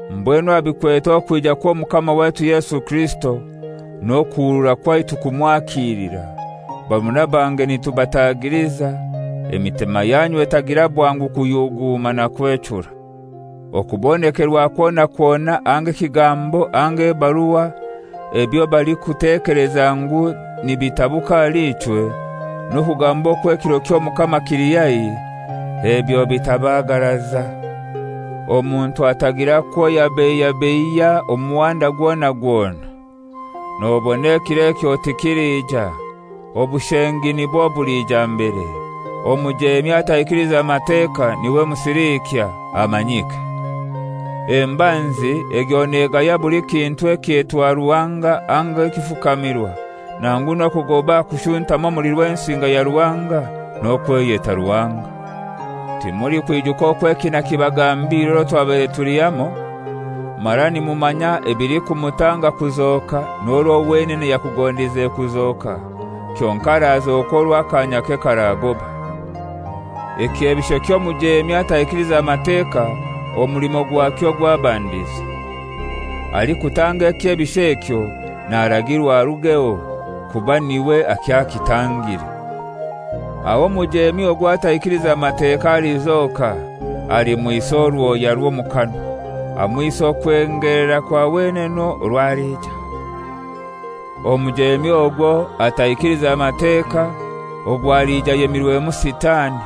Mbwenu aha bikwete okwija kw'Omukama waitu Yesu Kirisito n'okuhurura kwaitu kumwakilira, barumuna bange nitubatagiliza, emitima yanyu etagira bwangu kuyuguuma na kwechura. Okubonekerwa kwona kwona anga ekigambo anga ebarua, ebyo balikutekeleza ngu nibitabuka ahali ichwe, n'okugamba okwo ekiro ky'Omukama kili haihi, ebyo bitabaagaraza. Omuntu atagira kwoyababeiya omu muhanda gwona gwona. Nobona ekiro ekyo tikilija; obushengi nibwo bulija mbere, omujeemi ataikiliza Mateka, niwe Musiliikya, amanyike. Embanzi egyo negaya buli kintu ekyetwa ruhanga anga ekifukamirwa, nangu n'okugoba aha kushuntama omuli Rwensinga ya Ruhanga n'okweyeta Ruhanga. Timulikwijuka okwo eki nakibagambire orwo twabaire tuli hamoi? Mara nimumanya ebilikumutanga kuzoka n'orwo wenene yakugondize kuzoka, kyonkai arazoka orwo akanyake karagoba. Ekyebisho ky'omujemi ataikiliza Mateka omulimo gwakyo. Alikutanga eky'ebisho ekyo naragirwa arugeho, kuba niwe akyakitangire. Aho omujeemi ogwo ataikiliza Mateka alizoka, alimwisa orwoya rw'omukanwa, amwise okwengelera kwa wenene orwo aliija. Omujemi ogwo ataikiliza Mateka ogwo aliija ayemirwemu Sitani,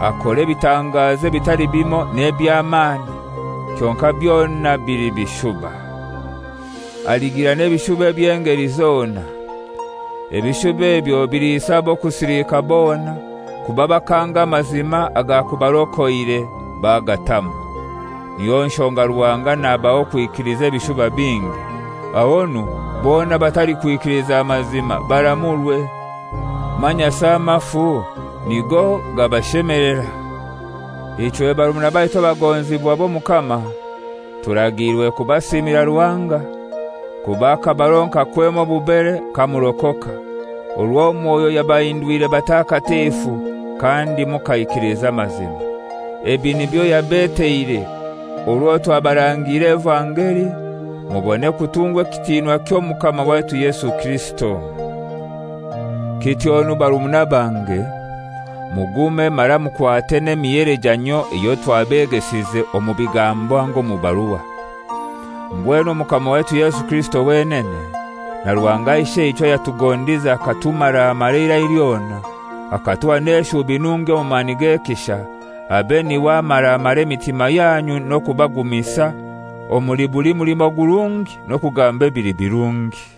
akore ebitangazo ebitali bimoi n'eby'amani, kyonkai byona bili bishuba. Aligira n'ebishuba eby'engeli zona. Ebishuba ebyo biliisa ab'okusilika bona, kuba bakanga amazima agakubarokoire, bagatamwa. Niyo nshonga Ruhanga nabaha okwikiliza ebishuba bingi, ahonu bona abatalikwikiliza mazima baramurwe, manyasi amafu nigo gabashemelera. Ichwe, barumuna baitu abagonzibwa b'Omukama, turagiirwe kubasiimira Ruhanga, kuba akabaronka kwema obubere kamurokoka, orwo Mwoyo yabahindwire batakatifu, kandi mukaikiliza amazima. Ebi nibyo yabeteire orwo twabarangiire evangeli mubone kutungwa ekitinwa ky'Omukama waitu Yesu Kirisito. Kityonu barumuna bange, mugume mara mukwate n'emihelejanyio eyo twabegesize omu bigambo anga omu barua. Mbwenu Omukama waitu Yesu Kirisito wenene, na Ruhanga Isheichwe, ayatugondize akatumaramara eirai lyona, akatuha n'eshubi nungi omu mani g'ekisha, abe niwe amaramara emitima yanyu n'okubagumisa omuli buli mulimo gurungi n'okugamba ebili birungi.